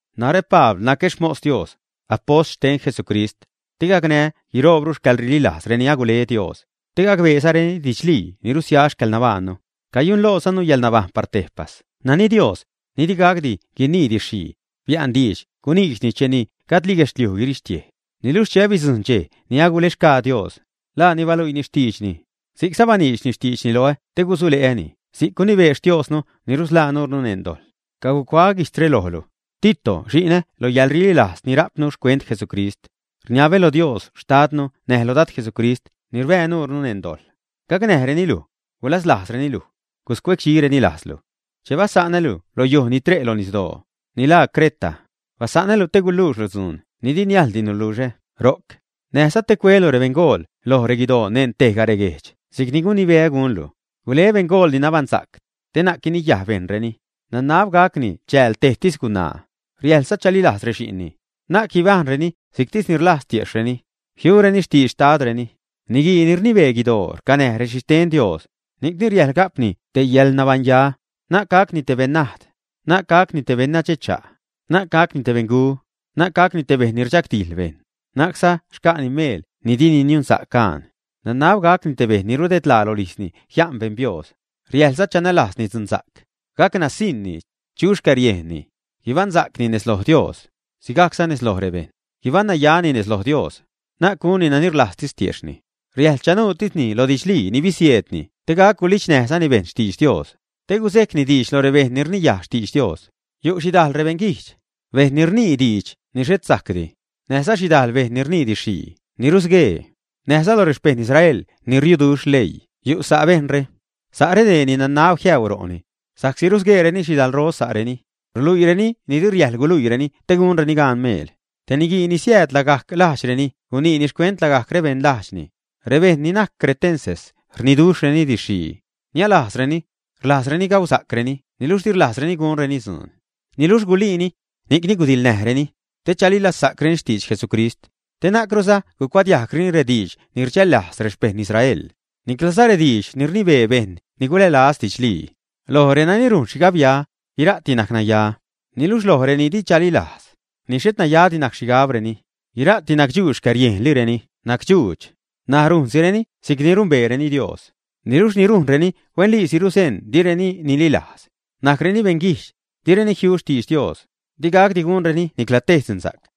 Narä Pabl, nacä xmos Dios, apost xten Jesucrist, te gacnää́ guiroobru xcäḻrililajz reni agule Dios, te gacbeezareni didxlii ni rusia xcäḻnabajṉnu. Cayunlojzanu yäḻnabajṉ par tejpas nani Dios, ni digacdi guinii didx-xhii, bia'nni diidx guniidxni cheni gajdli guedxliuj guirixtiej. Niluxh che bidzujṉ dxej ni agulexgaa Dios, laani baluiini xtiidxni. Si'cza baniidxni xtiidxni loä te gusule'äni si'c gunibee Xtiosnu ni rusḻaa nurnu neṉ dojḻ. Cacuaä guijtzre lojlu, Tito, xi'nä lo yäḻrililajz ni ria'pnu xcuent Jesucrist. Rniabä lo Dios Xtadnu näj lo Dad Jesucrist ni rbää nuurnu neṉ dojḻ, gacnäjreni luj, gulaslajzreni luj, guscuecdxizareni lajzlu. Che basa'nä́lu lo yuj ni tre' lo nisdoo, ni laa Creta, basa'nä́lu te guluuxlu dzuun ni di niajldi nuluxä ro'c, näjza te cuelu rebeṉgool loj reguidoo neṉ tejga reguejdx si'cni gunibeä gunlu. Gule beṉgool ni nabaṉsa'c, te na'c guiniyaj bejṉreni, nanab gacni chääl tejtis gunaa, riäjḻza chalilajz rexi'nni, na'c guibajṉreni si'ctisni rlajz tiejxhreni, jiureni xtidx xtadreni. Niguii ni rnibee guidoo rcanäj rexhixten Dios, ni'cni riäjḻ ga'pni te yäḻnabaṉya. Na'c gacni te beṉnajd, na'c gacni te beṉnadxecha', na'c gacni beṉgu, na'c gacni te bejṉ ni rdxagdijḻ bejṉ, na'cza xca'ni meel ni dini niunsa'c gaan. Nanab gacni te bejṉ ni rudedlaa rolijzni jia'n beṉ biooz, riäjḻza chanälajzni dzunsa'c, gac nasiṉni, chu xcäriejnni; guibaṉsa'cni nez lo Dios, sigajcza nez lo rebejṉ, guibaṉnayani nez lo Dios, na'c gunni nani rlajztis tiejxhni. Riäjḻ chanuutisni lo didxlii ni bisieedni te gac gulidxnäjzani bejṉ xtidx Dios, te guzejcni diidx lo rebejṉ ni rniyaj xtidx Dios. Yu' xhidajl beṉguijdx, bejṉ ni rnii diidx ni xhet sajcdi, näjza xhidajl bejṉ ni rnii didx-xhii ni rusguee. Näjza lo rexpeṉ Israel ni riuduxh leii yu' sa' bejṉre. Sa' redee ni nanab jiäu ro'ni, sa'csi rusgueereni xhidalro sa'reni, ruluiireni ni di riäjḻ guluiireni te gunreni gaan meel. Te niguii ni siääd lagajc lajdxreni guniini xcuent lagajc rebeṉ lajdxni: “Rebejṉ ni najc cretenses rniduxhreni didx-xhii, niälajzzareni. Rlajzreni gausa'creni niluxh di rlajzreni gunreni dzuun.” Niluxh guliini, ni'cni gudiḻnäjreni, te chalilazsa'creni xtidx Jesucrist, te na'cruza gucuadiajgreni rediidx ni rdxällajz rexpeṉ Israel, niclaza rediidx ni rnibee bejṉ ni gulälaz didxlii. Loj renani rujn xhigabya, guira'ti najc naya, niluxh loj reni di chalilajz, ni xhet nayadi najc xhigabreni, guira'ti nacdxuudx, xcäriejnlireni nacdxuudx. N̲aj rujnsireni si'cni numbeereni Dios, niluxh ni rujnreni huenliisi ruzeṉ direni nililajz, najcreni beṉguijdx, direni jiu xtidx Dios, digacdi gunreni nicla tej dzunsa'c.